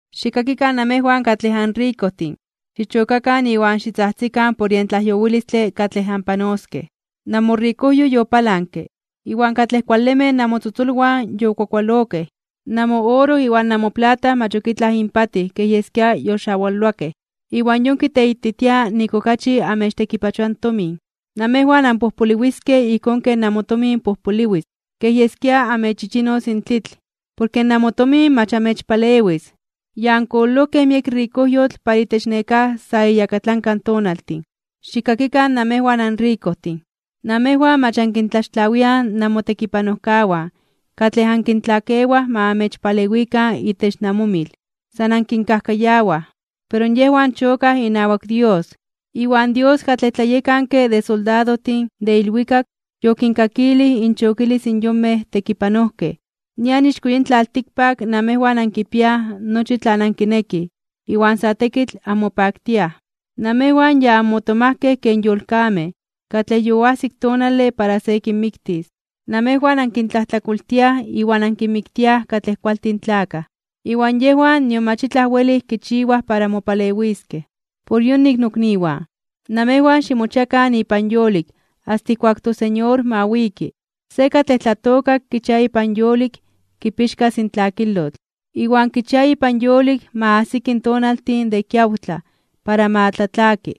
¡Xikkakikan namejwan katlej anrikojtin! Xichokakan iwan xitzajtzikan por yen tlajyowilistle katlej anpanoskej. Namorikojyo yopalanke, iwan katlej kualemej namotzotzolwan yokuakualokej. Namooro iwan namoplata mach ok itlaj inpatij kej yeskia yoxawaloakej. Iwan yon kiteititia nik okachi amechtekipachoa in tomin. Namejwan anpojpoliwiskej ijkón ken namotomin pojpoliwis, kej yeskia amechchichinos in tlitl, porke namotomin mach amechpalewis. Ya ankololojkej miek rikojyotl para itech nekáj sa iyakatlanka tonaltin. Xikkakikan namejwan anrikojtin. Namejwan mach ankintlaxtlawiaj namotekipanojkawan katlej ankintlakewaj ma amechpalewikan itech namomil. San ankinkajkayawaj. Pero yejwan chokaj inawak Dios. Iwan Dios katlej tlayekanke de soldadojtin de ilwikak yokinkakilij inchokilis in yonmej tekipanojkej. Nian ixko yin tlaltikpak namejwan ankipiaj nochi tlan ankinekij iwan sa tekitl anmopaktiaj. Namejwan ya anmotomajkej ken yolkamej katlej yoajsik tonale para se kinmiktis. Namejwan ankintlajtlakoltiaj iwan ankinmiktiaj katlej kualtin tlakaj, iwan yejwan nion mach itlaj welij kichiwaj para mopalewiskej. Por yonik, nokniwan, namejwan ximochiakan ipan yolik asta ijkuak toSeñor ma wiki. Se katlej tlatookak kichia ipan yolik kipixkas in tlakilotl, iwan kichia ipan yolik ma ajsiki in tonaltin de kiawtlaj para ma tlatlaki.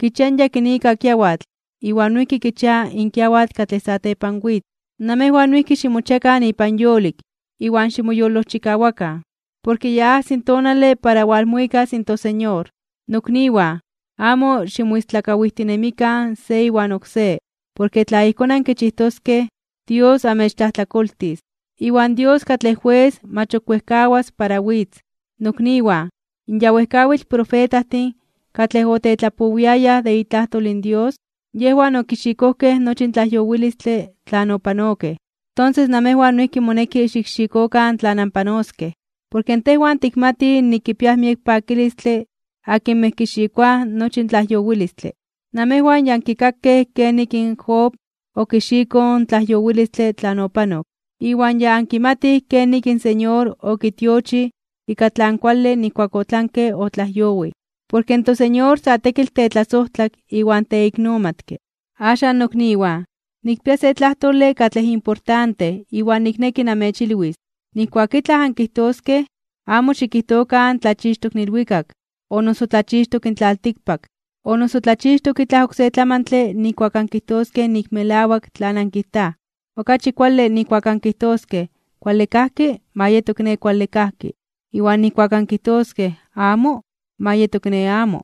Kichia in yakinika kiawatl iwan noijki kichia in kiawatl katlej satepan witz. Namejwan noijki ximochiakan ipan yolik, iwan ximoyolojchikawakan, porke ya ajsi in tonale para walmuikas in toSeñor. Nokniwan, amo ximoistlakawijtinemikan se iwan oksé, porke tla ijkón ankichijtoskej, Dios amechtlajtlakoltis. Iwan Dios katlej Jues mach ok wejkawas para witz. Nokniwan, in ya wejkawitl profetajtin katlej otetlapowiayaj de itlajtol in Dios, yejwan okixikojkej nochi in tlajyowilistle tlan opanokej. Tonses namejwan noijki moneki xikxikokan tlan anpanoskej. Porke tejwan tikmatij nik kipiaj miek pakilistle akinmej kixikoaj nochi in tlajyowilistle. Namejwan ya ankikakej kenik in Job okixikoj in tlajyowilistle tlan opanok, iwan ya ankimatij kenik in Señor okitiochij ika tlan kuale nijkuak otlanke otlajyowij. Porke in toSeñor sa tekitl tetlasojtlak iwan teiknomatke. Axan, nokniwan, nikpia se tlajtole katlej importante iwan nikneki namechilwis. Nijkuak itlaj ankijtoskej, amo xikijtokan tlachixtok in ilwikak, o noso tlachixtok in tlaltikpak, o noso tlachixtok itlaj oksé tlamantle nijkuak ankijtoskej nik melawak tlan ankijtaj. Okachi kuale nijkuak ankijtoskej “Kuale kajki”, ma yeto kiné kuale kajki, iwan nijkuak ankijtoskej “Amo”, ma yeto kiné amo.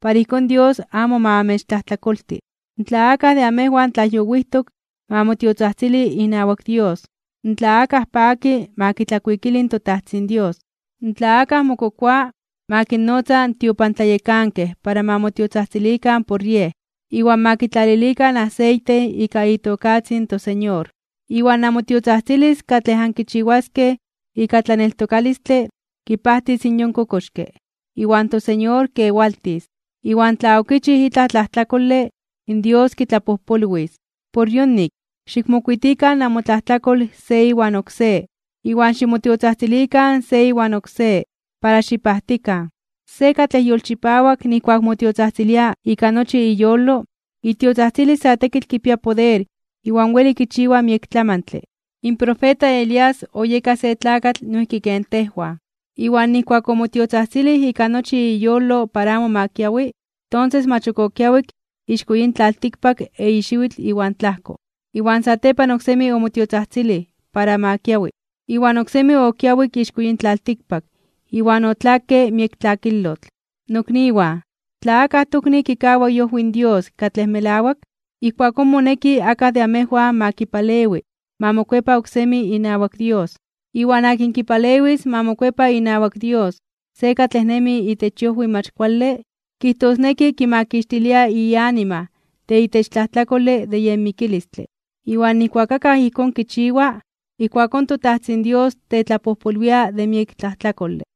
Para ijkón Dios amo ma amechtlajtlakolti. Tla akaj de amejwan tlajyowijtok, ma motiotzajtzili inawak Dios. Tla akaj paki, ma kitlakuikili in toTajtzin Dios. Tla akaj mokokoa, ma kinnotza in tiopantlayekankej para ma motiotzajtzilikan por yej, iwan ma kitlalilikan aseite ika itokatzin in toSeñor. Iwan namotiotzajtzilis katlej ankichiwaskej ika tlaneltokalistle kipajtis in yon kokoxke, iwan toSeñor kewaltis. Iwan tla okichij itlaj tlajtlakole, in Dios kitlapojpolwis. Por yonik, xikmokuitikan namotlajtlakol se iwan oksé, iwan ximotiotzajtzilikan se iwan oksé para xipajtikan. Se katlej yolchipawak nijkuak motiotzajtzilia ika nochi iyolo, itiotzajtzilis sa tekitl kipia poder iwan weli kichiwa miek tlamantle. In profeta Elías oyeka se tlakatl noijki ken tejwan. Iwan nijkuak omotiotzajtzilij ika nochi iyolo para amo ma kiawi, tonses mach ok okiawik ixko yin tlaltikpak eyi xiwitl iwan tlajko. Iwan satepan oksemi omotiotzajtzilij para ma kiawi, iwan oksemi okiawik ixko yin tlaltikpak iwan otlakke miek tlakilotl. Nokniwan, tla akaj tokni kikawa iojwi in Dios katlej melawak, ijkuakón moneki akaj de amejwan ma kipalewi ma mokuepa oksemi inawak Dios. Iwan akin kipalewis ma mokuepa inawak Dios se katlej nemi itech iojwi mach kuale, kijtosneki kimakixtilia ianima de itech tlajtlakolej de yen mikilistle. Iwan nijkuak akaj ijkón kichiwa, ijkuakón toTajtzin Dios tetlapojpolwia de miek tlajtlakole.